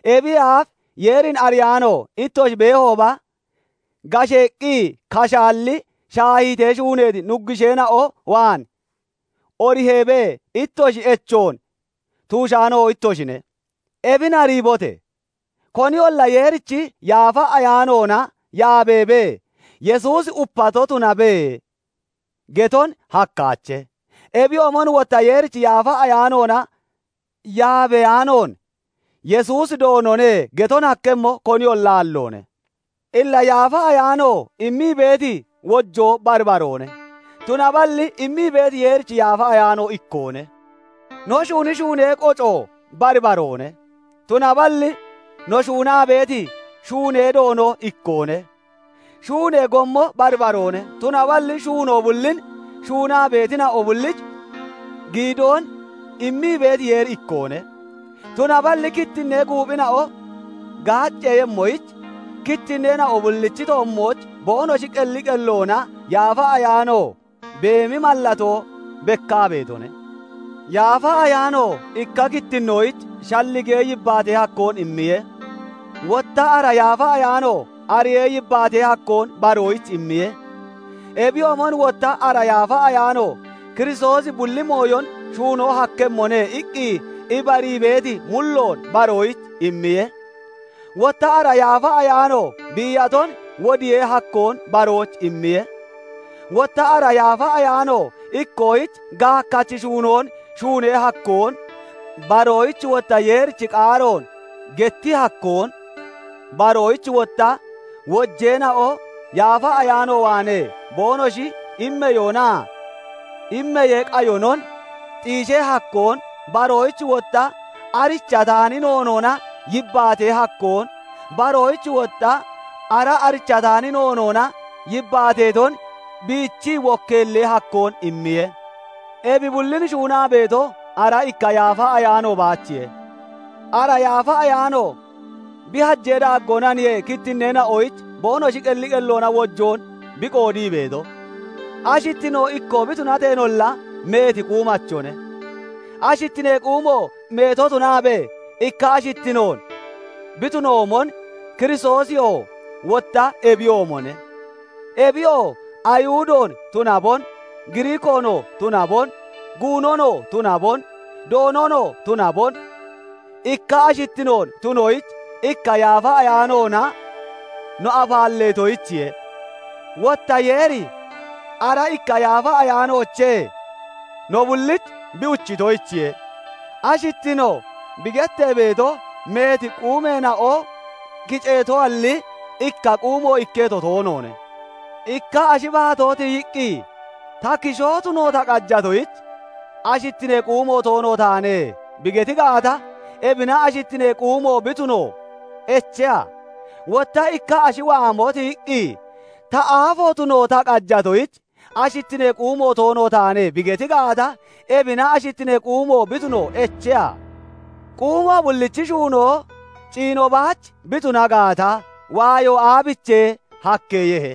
Ebiyee aaf Yeerin ariyaano ittoshi beehooba, gasheeqqi kashaalli shaahiitee shuuneeti nuggusheena'o waan oriheebee ittoshi echoon tuushaano ittoshine. Ebin ariibote! Koniyolla Yeerichi Yaafa Ayaanoona yaabeebee, "Yesuusi upato tunabe" geton hakkaache; ebiyoomon wotta Yeerichi Yaafa Ayaanoona yaabeyaanoon, "Yesuusi Doonone" geton hakkemmo, koniyolla aalloone. Illa Yaafa Ayaano immii beeti wojoo bari baroone; tunaballi immii beeti Yeerichi Yaafa Ayaano ikkoone. No shuuni shuunee qoco bari baroone; tunaballi no shuunaa beeti shuunee Doono ikkoone. Shuunee gommo bari baroone; tunaballi shuunoo bullin shuunaa beetina'o bullich giidoon immii beeti Yeeri ikkoone. Tunaballi kittinnee guuphina'o gaacceeyemmoyich, kittinneena'o bullichi toommooch boonoshi qelli qelloona Yaafa Ayaano beemi mallatoo bekkaa beetone. Yaafa Ayaano ikka kittinnoyich shalligee yibbaatee hakkoon immiye; wotta ara Yaafa Ayaano ariyee yibbaatee hakkoon baroyich immiye. Ebiyoomon wotta ara Yaafa Ayaano "Kiristoosi bulli mooyon shuuno hakkemmone" iqqi ibarii beeti mulloon baroyich immiye; wotta ara Yaafa Ayaano biiyaton wodiyee hakkoon baroyich immiye; wotta ara Yaafa Ayaano ikkoyich gaakkachi shuunoon shuunee hakkoon, baroyich wotta Yeerichi qaaroon getti hakkoon, baroyich wotta wojeena'o Yaafa Ayaano waanee boonoshi immeyoonaa immeyee qayonon xiishee hakkoon, baroyich wotta arichataani noonoona yibbaatee hakkoon, baroyich wotta ara arichataani noonoona yibbaateeton biichii wokkeellee hakkoon immiye. Ebi bullin shuunaa beeto, ara ikka Yaafa Ayaano baachiye. Ara Yaafa Ayaano bi hajee daaggoonaniye kittinneena'oyich boonoshi qelli qelloona wojoon bi qoodii beeto. Ashittino ikkoo bi tunateenolla, meeti quumachone; ashittinee quumo meeto tunaabee ikka ashittinoon bi tunoomon, Kiristoosiyoo wotta ebiyoomone. Ebiyoo Ayihudoon tunabon, Giriikoonoo tunabon, guunonoo tunabon, doononoo tunabon, ikka ashittinoon tunoyich ikka Yaafa Ayaanoona no afaalleetoyichiye; wotta Yeeri ara ikka Yaafa Ayaanoochee no bullich bi uchitoyichiye. Ashittino bi gettee beeto meeti quumeena'o kiceetoalli, ikka quumo ikketo toonoone. Ikka ashi baatoo tiyiqqi, "Ta, kishoo tuno ta qajatoyich, ashittinee quumo toono taane" bi geti gaata, ebina ashittinee quumo bi tuno echeha? Wotta ikka ashi waamo tiyiqqi, "Ta, aafo tuno ta qajatoyich, ashittinee quumo toono taane" bi geti gaata, ebina ashittinee quumo bi tuno echeha? Quumo bullichi shuunoo ciino baach bi tuna gaata, waayo aabichee hakkeeyehe?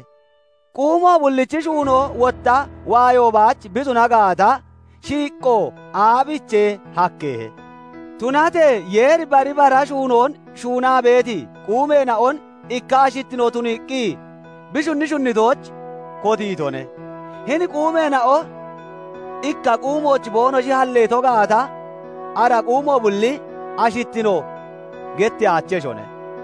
Quumo bullichi shuunoo wotta waayo baach bi tuna gaata, shiiqqo aabichee hakkeeyehe? Tunatee Yeeri bari bara shuunoon shuunaa beeti quumeena'on ikka ashittino tuniiqqi bi shunni shunnitooch kotiitone. Hini quumeena'o ikka quumooch boonoshi halleeto gaata, ara quumo bulli "ashittino" getteyaacheshone.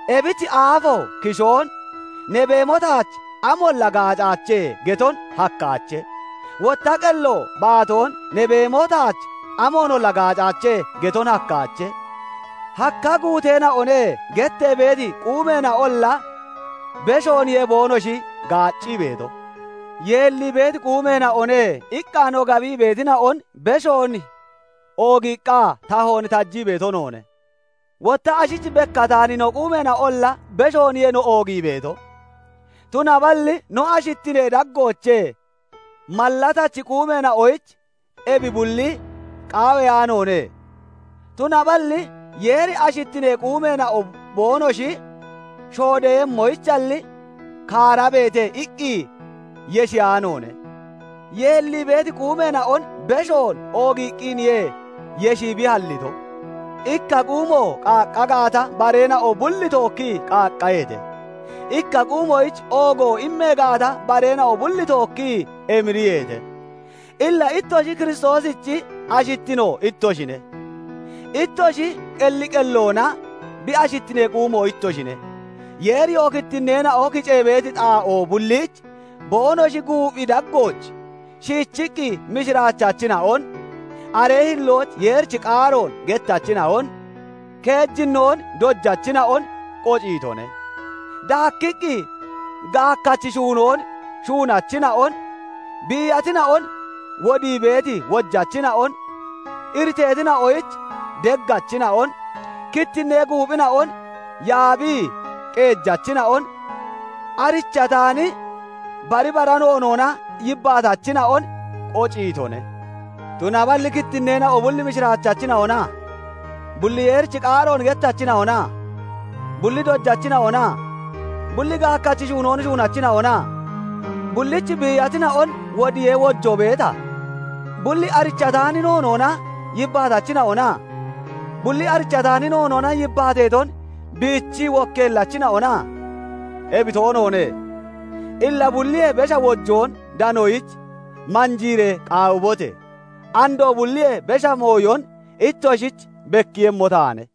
Ebich aafo kishoon "Ne beemo taach amoonolla gaacaache" geton hakkaache; wotta qello baatoon "Ne beemo taach amoonolla gaacaache" geton hakkaache. "Hakka guuteena'one" gettee beeti quumeena'olla beshooniye boonoshi gaaccii beeto. "Yeellii beeti quumeena'one" iqqa no gabii beetina'on beshoon oogiiqqa tahoon tajii beeto noone; wotta ashich bekkataani no quumeena'onolla beshooniye no oogii beeto. Tunaballi no ashittinee daggoochee mallatachi quumeena'oyich ebi bulli qaawiyaanoone; tunaballi Yeeri ashittinee quumeena'o boonoshi shoodeeyemmoyichalli, "Kaarabeete" iqqi yeshiyaanoone; yeellii beeti quumeena'on beshoon oogiiqqiniye yeshii bi hallito. Ikka quumo qaaqqa gaata, bareena'o bulli tookkii qaaqqaheete; ikka quumoyich oogo immee gaata, bareena'o bulli tookkii emiriyeete. Illa ittoshi Kiristoosichi ashittino ittoshine; ittoshi qelli qelloona bi ashittinee quumo ittoshine. Yeeriyoo kittinneena'o kicee beeti xaa'oo bulliich boonoshi guuphi daggooch shiichiqqi mishiraachachina'on, aree hillooch Yeerichi qaaroon gettachina'on, keejinnoon dojachina'on qociitone; daakkiqqi gaakkachi shuunoon shuunachina'on, biiyatina'on wodii beeti wojachina'on, iriteetina'oyich deggachina'on, kittinnee guuphina'on yaabii qeejachina'on, arichataani bari bara noonoona yibbaatachina'on qociitone. Tunaballi kittinneena'o bulli mishiraachachina'ona? Bulli Yeerichi qaaroon gettachina'ona? Bulli dojachina'ona? Bulli gaakkachi shuunoon shuunachina'ona? Bullich biiyatina'on wodiyee wojoo beeta? Bulli arichataani noonoona yibbaatachina'ona? Bulli arichataani noonoona yibbaateeton biichii wokkeellachina'ona? Ebi toonoone. Illa bulliyee besha wojoon danoyich manjiiree qaawibote! Andoo bulliyee besha mooyon ittoshich bekkiiyemmo taane.